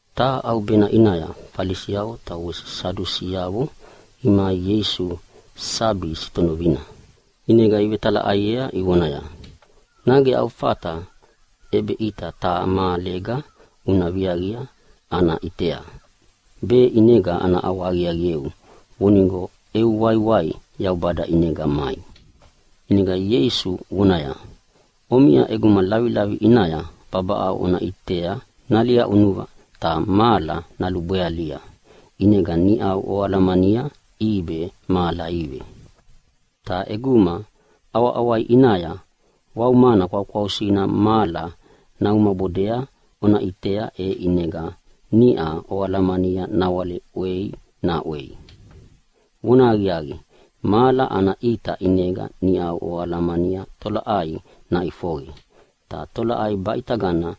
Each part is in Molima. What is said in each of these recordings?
Taha ʼaubena ʼinaya Falisiavo ta wese Sadusiavo imai Ieisu ʼinaya sabi sitonovina, ʼinega ivetalaʼaiea ivonaya, “Nage au fata ʼebeʼita taha mahalega una viaqi ana ʼitea, be ʼinega ana ʼawahaqiaqieu vonigo eu waiwai Yaubada ʼinega mai.” ʼInega Ieisu vonaya, “Omiʼa ʼeguma lavilavi ʼinaya babaʼau ona ʼitea naliaʼunuva ta mahala nalubwealia, ʼinega niʼau oalamania ʼibe mahala ive. Ta ʼeguma ʼawaʼawai ʼinaya waumana kwaukwausina mahala naumabodea ona ʼitea, e ʼinega niʼau oalamania nawale ʼwei naʼwei. Vonahaqiaqi, mahala ana ʼita ʼinega niʼa oalamania tolaʼai naʼifoqe, ta tolaʼai baʼitagana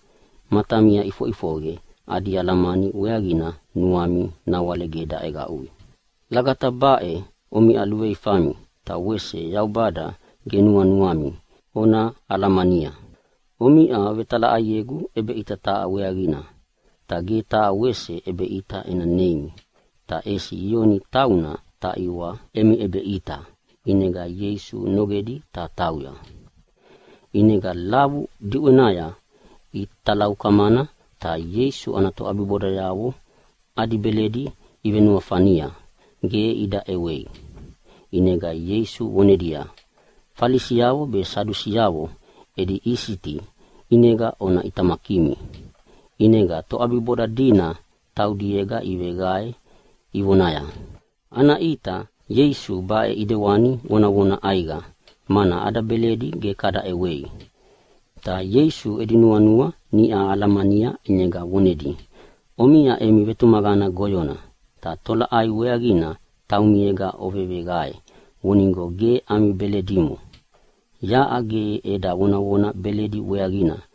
matamia iʼifoʼifoqe adi alamani weaqina nuami nawale ge daʼeqaʼui. Lagata baʼe omiʼa luveifami ta wese Yaubada ge nuanuami ona alamania. Omiʼa ovetalaʼaiegu ʼebeʼita taha weaqina. Ta ge taha wese ʼebeʼita ena neimi, ta ʼesi Iona tauna taʼiwa emi ʼebeʼita.” ʼInega Ieisu nogedi ta tauya. ʼInega lavu diʼwenaya italaukamana ta Ieisu ana toʼabibodayavo adi beledi ivenuafania ge ida ʼewei. ʼInega Ieisu vonedia, “Falisiavo be Sadusiavo edi isiti ʼinega ona ʼitamakimi.” ʼInega toʼabiboda dina taudiega iveqae ivonaya, “Ana ʼita Ieisu baʼe ʼidewani vonavona ʼaiqa, mana ada beledi ge kada ʼewei.” Ta Ieisu edi nuanua niʼa alamania ʼinega vonedi, “Omiʼa emi vetumaqana goyona. Tolaʼai weaqina taumiega oveveqae vonigo ge ami beledimo? Yaʼa ge eda vonavona beledi weaqina.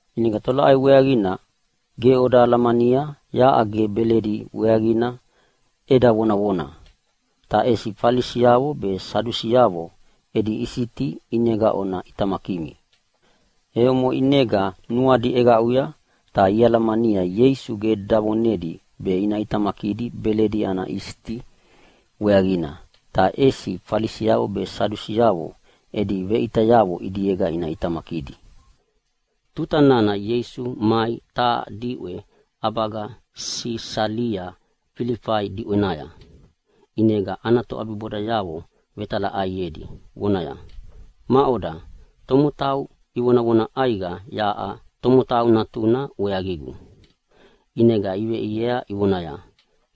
ʼInega tolaʼai weaqina ge oda alamania yaʼa ge beledi weaqina eda vonavona? Ta ʼesi Falisiavo be Sadusiavo edi isiti ʼinega ona ʼitamakimi.” E omoʼe ʼinega nuadi ʼeqaʼuya ta ialamania Ieisu ge davonedi be ina ʼitamakidi beledi ana isiti weaqina, ta ʼesi Falisiavo be Sadusiavo edi veʼitayavo ʼidiega ina ʼitamakidi. Tuta nana Ieisu mai taha diʼwe ʼabaga Sisalia Filifai diʼwenaya, ʼinega ana toʼabibodayavo vetalaʼaiedi vonaya, “Maʼoda tomotau ivonavona ʼaiqa yaʼa Tomotau Natuna weaqigu?” ʼInega iveʼiea ivonaya,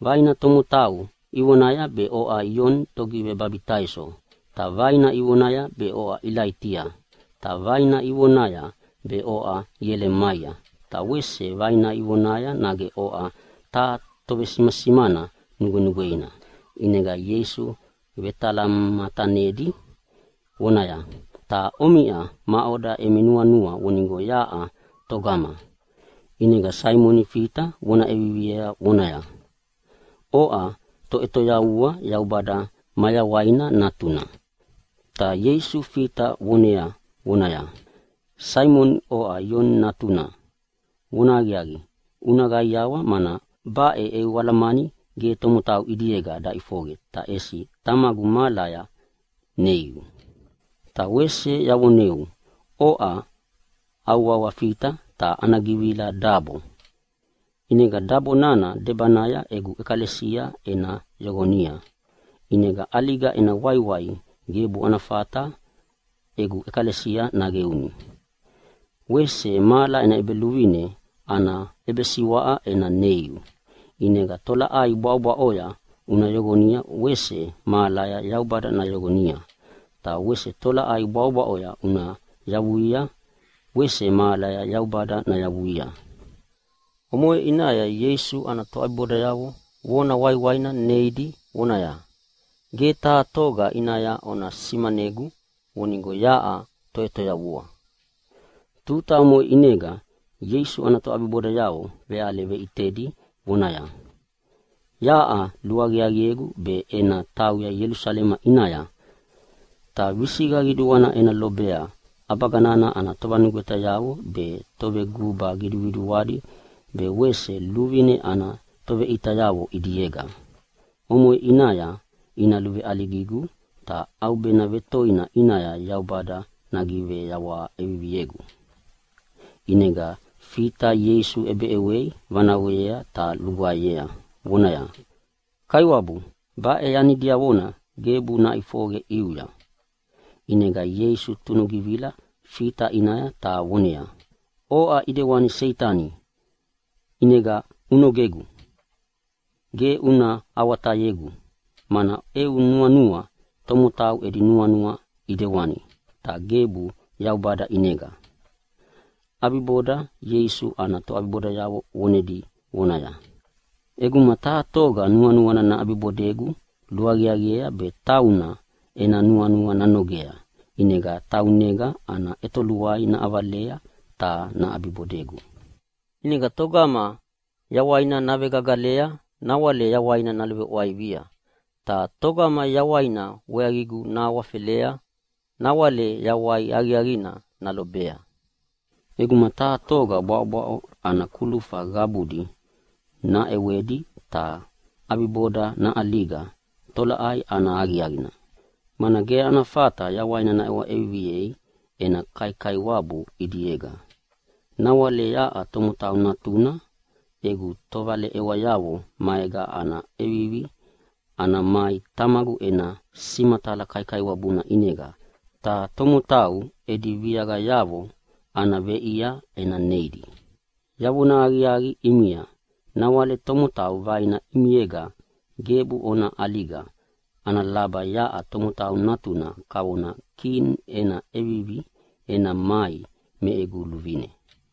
“Vaina tomotau ivonaya be oʼa Ioni Togivebabitaiso, ta vaina ivonaya be oʼa Ilaitia, ta vaina ivonaya be oʼa Ielemaia, ta wese vaina ivonaya nage oʼa taha tovesimasimana nugwenugweina.” ʼInega Ieisu vetalamatanedi vonaya, “Ta omiʼa, maʼoda emi nuanua vonigo yaʼa togama?” ʼInega Saimoni Fita vona ʼeviviea vonaya, “Oʼa Toʼetoyavua, Yaubada mayawaina Natuna!” Ta Ieisu Fita vonea vonaya, “Saimoni oʼa Ioni natuna, vonahaqiaqi una qaiawa, mana baʼe eu alamani ge tomotau ʼidiega daʼifoqe ta ʼesi Tamagu mahalaya neiu. Ta wese yavoneu, oʼa au wawa Fita ta ana givila dabo, ʼinega dabo nana debanaya egu ʼekalesia ena yoqonia, ʼinega ʼaliga ena waiwai gebu ana fata egu ʼekalesia naqeuni. Wese mahala ena ʼEbeluvine ana ʼebesiwaʼa ena neiu, ʼinega tolaʼai bwaʼobwaʼoya una yoqonia wese mahalaya Yaubada nayoqonia. Ta wese tolaʼai bwaʼobwaʼoya una yavuia wese mahalaya Yaubada nayavuia.” Omoʼe ʼinaya Ieisu ana toʼabibodayavo vona waiwaina neidi vonedia, “Ge taha toga ʼinaya ona simanegu vonigo yaʼa Toʼetoyavua.” Tuta omoʼe ʼinega Ieisu ana toʼabibodayavo veʼale veʼitedi vonaya, “Yaʼa luaqiaqiegu be ena tauya Ielusalema ʼinaya, ta visiqa qiduana ena lobea ʼabaga ana tovanugwetayavo be toveguba qiduqiduadi ta wese luvine ana toveʼitayavo ʼidiega. Omoʼe ʼinaya ina luveʼaligigu ta ʼaubena vetoina ʼinaya Yaubada nagiveyawaha ʼeviviegu.” ʼInega Fita Ieisu ʼebeʼewei vanaqoyea ta lugwaeyea vonaya, “Kaiwabu, baʼe yani diavona gebu naʼifoqe ʼiuya!” ʼInega Ieisu tunugivila Fita ʼinaya ta voneaya, “Oʼa ʼidewani Seitani, ʼinega unogegu! Ge una awatayegu, mana eu nuanua tomotau edi nuanua ʼidewani, ta gebu Yaubada ʼinega.” ʼAbiboda Ieisu ana toʼabibodayavo vonedi vonaya, “ʼEguma taha toga nuanuana naʼabibodegu luaqiaqiea be tauna ena nuanua nanogea ʼinega taunega ana ʼetoluai naʼavalea ta naʼabibodegu. ʼInega togama yawaina navegagalea nawale yawaina naluveʼwaivia, ta togama yawaina weaqigu nahawafelea nawale yawai aqiaqina nalobea. ʼEguma taha toga bwaʼobwaʼo ana kulufayavo qabudi naʼewedi ta ʼabiboda naʼaliga, tolaʼai ana aqiaqina? Mana ge ana fata yawaina naʼewa ʼeviviei ena kaikaiwabu ʼidiega. “Nawale yaʼa Tomotau Natuna egu tovaleʼewayavo maega ana ʼevivi ana mai Tamagu ena simatala kaikaiwabuna ʼinega, ta tomotau edi viaqayavo ana veʼia ena neidi. Yavona aqiaqi ʼimia, nawale tomotau vaina ʼimiega gebu ona ʼaliga ana laba yaʼa Tomotau Natuna kavona Kini ena ʼevivi ena mai me egu luvine.”